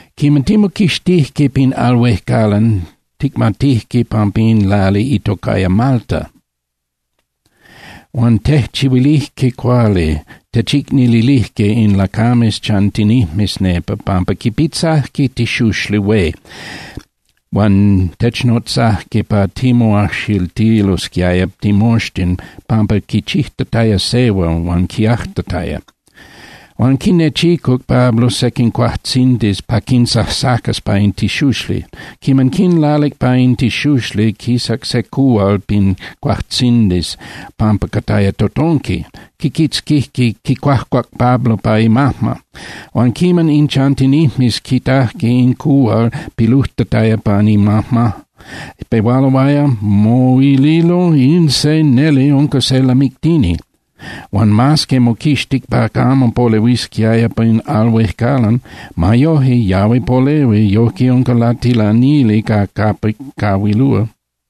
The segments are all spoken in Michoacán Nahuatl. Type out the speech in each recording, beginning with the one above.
Quiman timoquixtijque pin al huejcalan, ticmatijque pampa in lali itocaya Malta. Huan tejchihuilijque cuali, techicnilijque in lacames chantinijmes nepa, pampa quipitzajque tixuxli hué huan technotzajque pa timoajxiltilosquiaya timoxtin pampa quichijtataya sehua huan quiajtataya. Huan quinechicuc Pablo sequin cuajtzindis pa quinsajsacas pa in tixuxli. Quiman quinlalic pan in tixuxli, quisac se cuhual pin cuatzindis pampa cataya totonqui, quiquitzquic quicuajcuac Pablo pa imajma. Huan quiman in chantinijmes quitajque in cuhual pilujtataya pan imajma, pehualoaya moililo: —In se neli unca se lamictini. Huan mas que moquixtic pa camo polehuisquiaya pin al huejcalan, ma yoje yahui polehui, yojque unca latilanili ca capic cahuilúa.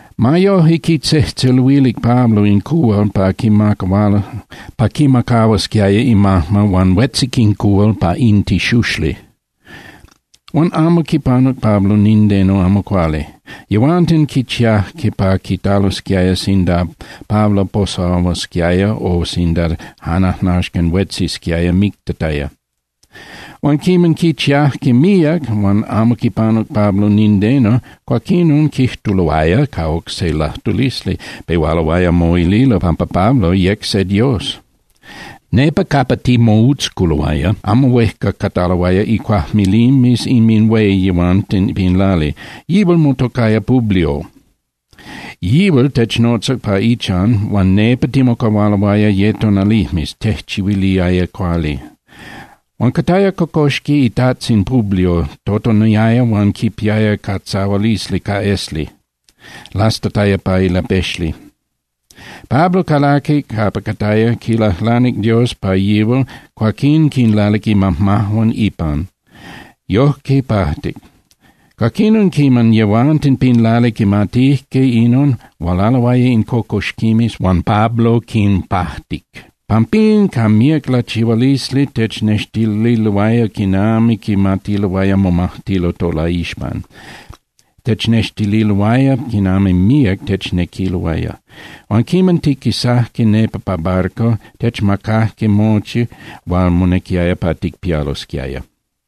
Ma yoje, quitzejtzeluilic Pablo in cuhual pa quimacahuasquiaya imajma huan huetzic in cuhual pa in tixuxli, huan amo quipanuc Pablo nindeno amo cuali. Yehuanten quichiajque pa quitalosquiaya sinda Pablo posahuasquiaya o sinda jan ajnaxcan huetzisquiaya mictataya. Huan quiman quichiajque míac, huan amo quipanuc Pablo nindeno, cuaquinon quijtuloaya ca oc se lajtulisli, pehualoaya moililo pampa Pablo yec se dios. Nepa capa timoutzculoaya, amo huejca cataloaya icuajmilimes inminhué yehuanten pin lali. Yihual motocaya Publio. Yihual technotzac pa ichan huan nepa timocahualoaya ye tonalijmes, tejchihuiliaya cuali. Huan cataya cocoxqui itajtzin Publio, totoniaya huan quipiaya catzahualisli ca esli, lastataya pa ilapexli. Pablo calaquic capa cataya, quilajlanic Dios pa yihual, cuaquín quinlalic imajmajuan ipan, yojque pajtic. Cuaquinon, quiman yehuanten pin lali quimatijque inon, hualaloaya in cocoxquimes huan Pablo quinpajtic. Pampín ca míac lachihualisli technextililoaya quinami quimatiloaya momajtilo tolaixpan, technextililoaya quinami míac technequiloaya. Huan quiman tiquisajque nepa ca barco, techmacajque mochi hual monequiaya pa ticpialosquiaya.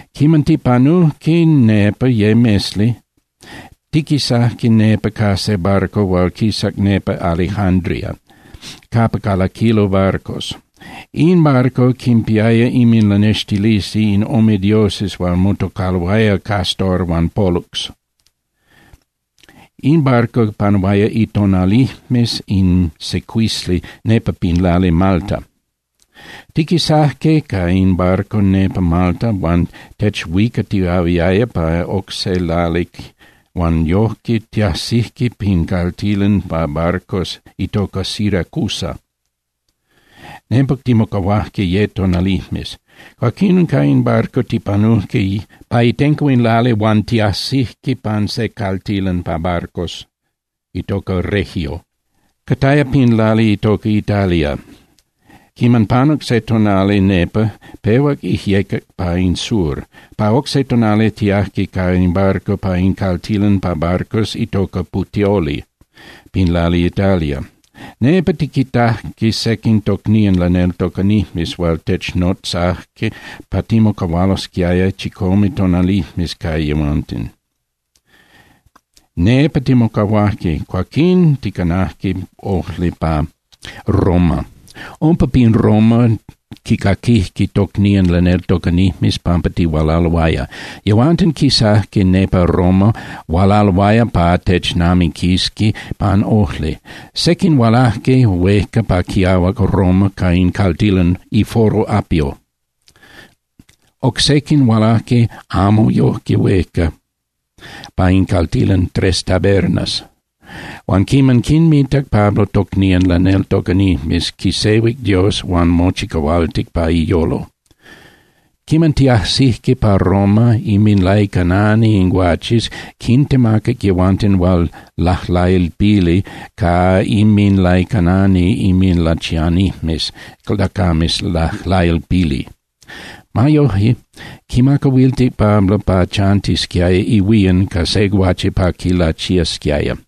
Quiman tipanujque nepa ye mesli, tiquisajque nepa ca se barco hual quisac nepa Alejandría capa calaquilo barcos. In barco quinpiaya inminlanextilisli in ome dioses hual motocaloaya Castor huan Pólux. In barco panuaya itonalijmes in secuisli nepa pin lali Malta. Tiquisajque ca in barco nepa Malta huan techhuicatiahuiaya pa oc se lali huan yoje tiajsijque pin caltilan pa barcos itoca Siracusa. Nepa timocahuajque ye tonalijmes. Cuaquinon ca in barco tipanujque pa itenco in lali huan tiajsijque pan se caltilan pa barcos itoca Regio, cataya pin lali itoca Italia. Quiman panuc se tonali nepa, pehuac ijyecac pa in sur. Pa oc se tonali tiajque ca in barco pa in caltilan pa barcos itoca Puteoli pin lali Italia. Nepa tiquitaje sequin tocnían laneltocanijmes hual technotzajque pa timocahualosquiaya chicome tonalijmes ca yehuanten. Nepa timocahuajque, cuaquín ticanajque ojli pa Roma. Umpa pin Roma quicaquijque tocnían laneltocanijmes pampa tihualaloaya. Yehuanten quisajque nepa Roma, hualaloaya pa technamiquisqui pan ojli. Sequin hualajque huejca pa quiahuac Roma pa in caltilan iForo Apio, oc sequin hualajque amo yoje huejca pa in caltilan Tres Tabernas. Huan quiman quinmitac Pablo tocnían laneltocanijmes, quisehuic Dios huan mochicahualtic pa iyolo. Quiman tiajsijque pa Roma, inminlaicanani in guaches quintemacac yehuanten hual lajlailpili ca inminlaicanani inminlachianijmes lacames lajlailpili. Ma yoje, quimacahuiltic Pablo pa chantisquiaya ihuían ca se guache pa quilachiasquiaya.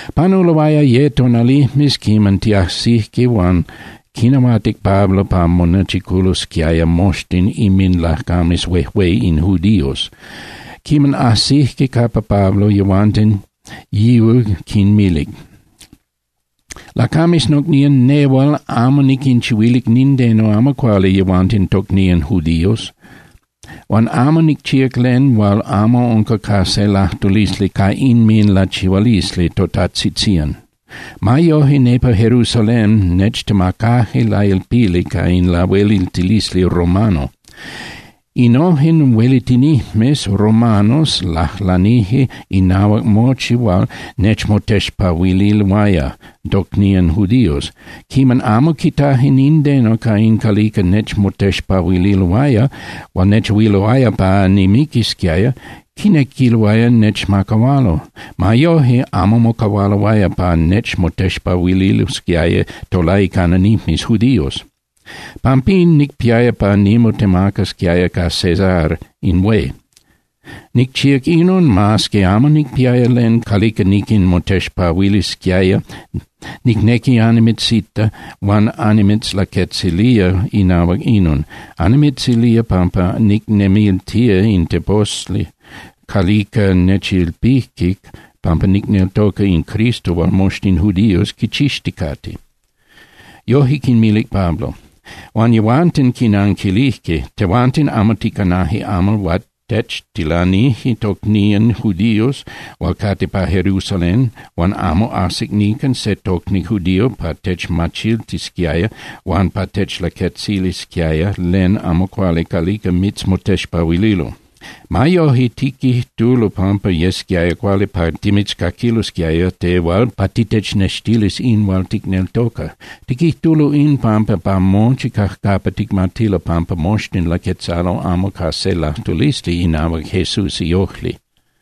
Panuloaya ye tonalijmes quiman tiajsijque huan quinahuatic Pablo pa monechiculosquiaya moxtin inminlacames huejué in judíos. Quiman ajsijque capa Pablo yehuanten, yihual quinmilic: —Lacames nocnían nehual amo niquinchihuilic nindeno amo cuali yehuanten tocnían judíos, huan amo nicchíac len hual amo unca ca se lajtulisli ca inminlachihualisli totatzitzían. Ma yoje nepa Jerusalén nechtemacaje lailpili ca in lahueliltilisli romano. Innojen huelitinijmes romanos lajlanije inahuac mochi hual nechmotexpahuililoaya tocnían judíos. Quiman amo quitaje nindeno ca in calica nechmotexpahuililoaya hual nechahuiluaya pa nimiquisquiaya, quinequiloaya nechmacahualo. Ma yoje, amo mocahualoaya pa nechmotexpahuililosquiaya tolaicananijmes judíos. Pampín, nicpiaya pa nimotemacasquiaya ca Cesar in hué. Nicchíac inon mas que amo nicpiaya len calica niquinmotexpahuilisquiaya nocnían judíos. Pampín nilanahuatic pa anhualasquiaya. Nicnequiaya annimitzita huan annimitzlaquetzilía inahuac inon. Annimitzilía pampa nicnemiltía in teposli calica nechilpije pampa nicneltoca in Cristo hual moxtin judíos quichixticate. Yoje quinmilic Pablo. Huan yehuanten quinanquilijque: —Tehuanten amo ticanaje amal hual techtilanije tocnían judíos hual cate pa Jerusalén huan amo ajsic nican se tocni judío pa techmachiltisquiaya huan pa techlaquetzilisquiaya len amo cuali calica mitzmotexpahuililo. Ma yoje, tiquijtulo pampa yesquiaya cuali pa timitzcaquilosquiaya tehual pa titechnextilis in hual ticneltoca. Tiquijtulo in pampa pa mochi cajcapa ticmatilo pampa moxtin laquetzalo amo ca se lajtulisli inahuac Jesús iojli.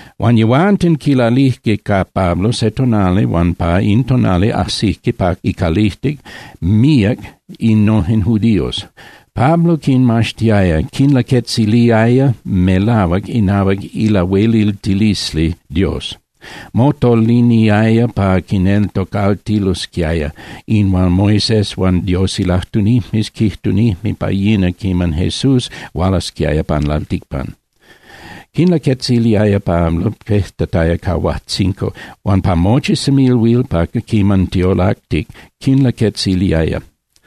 Huan yehuanten quilalijque ca Pablo se tonali huan pa in tonali ajsijque pa icalijtic míac innojen judíos. Pablo quinmaxtiaya, quinlaquetziliaya melahuac inahuac ilahueliltilisli Dios. Motoliniaya pa quinneltocaltilosquiaya in hual Moisés huan Dios ilajtunijmes quijtunijme pa yina quinami Jesús hualasquiaya pan lalticpan. Quinlaquetziliaya Pablo pejtataya pa huajtzinco, huan pa mochi semilhuil pa quiman tiolactic quinlaquetziliaya.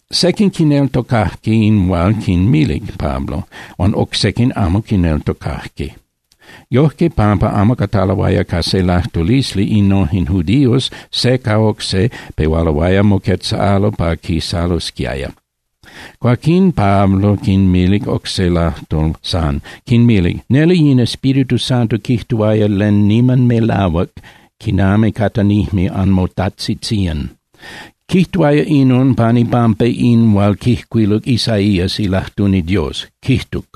Sequin quineltocajque in hual quinmilic Pablo, huan oc sequin amo quineltocajque. Yojque, pampa amo cataloaya ca se lajtulisli innojen judíos se ca oc se, pehualoaya moquetzalo pa quisalosquiaya. Cuaquín Pablo quinmilic oc se lajtol san, quinmilic: —Neli in Espíritu Santo quijtuaya len niman melahuac quinami catanijme anmotajtzitzían. Quijtuaya inon pan ipampa in hual quijcuiluc Isaías ilajtuni Dios, quijtuc: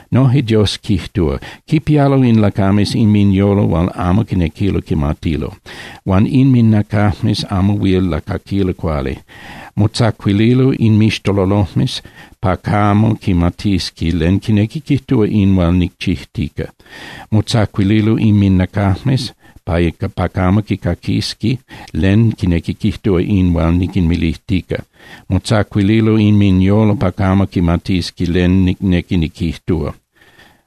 Noje Dios quijtúa: Quipialo in lacames inminyolo hual amo quinequilo quimatilo, huan inminacajmes amo huil lacaquilo cuali. Motzacuililo inmixtololojmes pa camo quimatisqui len quinequi quijtúa in hual nicchijtica. Motzacuililo inminacajmes pa camo quicaquisqui len quinequi quijtúa in hual niquinmilijtica. Motzacuililo inminyolo pa camo quimatisqui len nicnequi niquijtúa,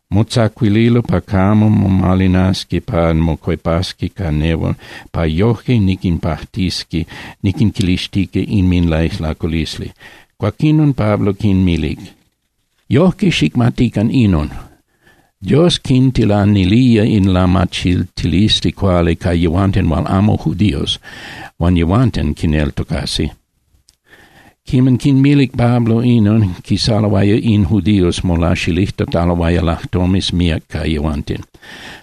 motzacuililo pa camo momalinasqui pa mocuepasqui ca nehual pa yoje niquinpajtisqui niquinquixtilijtica inminlaijlaculisli. Cuaquinon Pablo quinmilic: —Yojque, xicmatican inon. Dios quintilanilía in lamachiltilisli cuali ca yehuanten hual amo judíos, huan yehuanten quineltocasi. Quiman quinmilic Pablo inon, quisaloaya in judíos molaxilijtataloaya lajtomes míac ca yehuanten.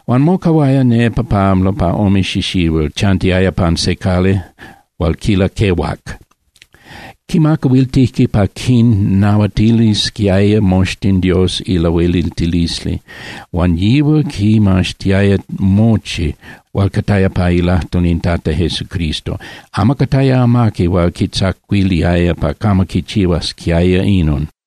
Huan mocahuaya nepa Pablo pa ome xixihuil, chantiaya pan se cali hual quilaquehuac. Quimacahuiltijque pa quinnahuatilisquiaya moxtin Dios ilahueliltilisli, huan yihual quimaxtiaya mochi hual cataya pa ilajtol in Tata Jesucristo. Amo cataya amaqui hual quitzacuiliaya pa camo quichihuasquiaya inon.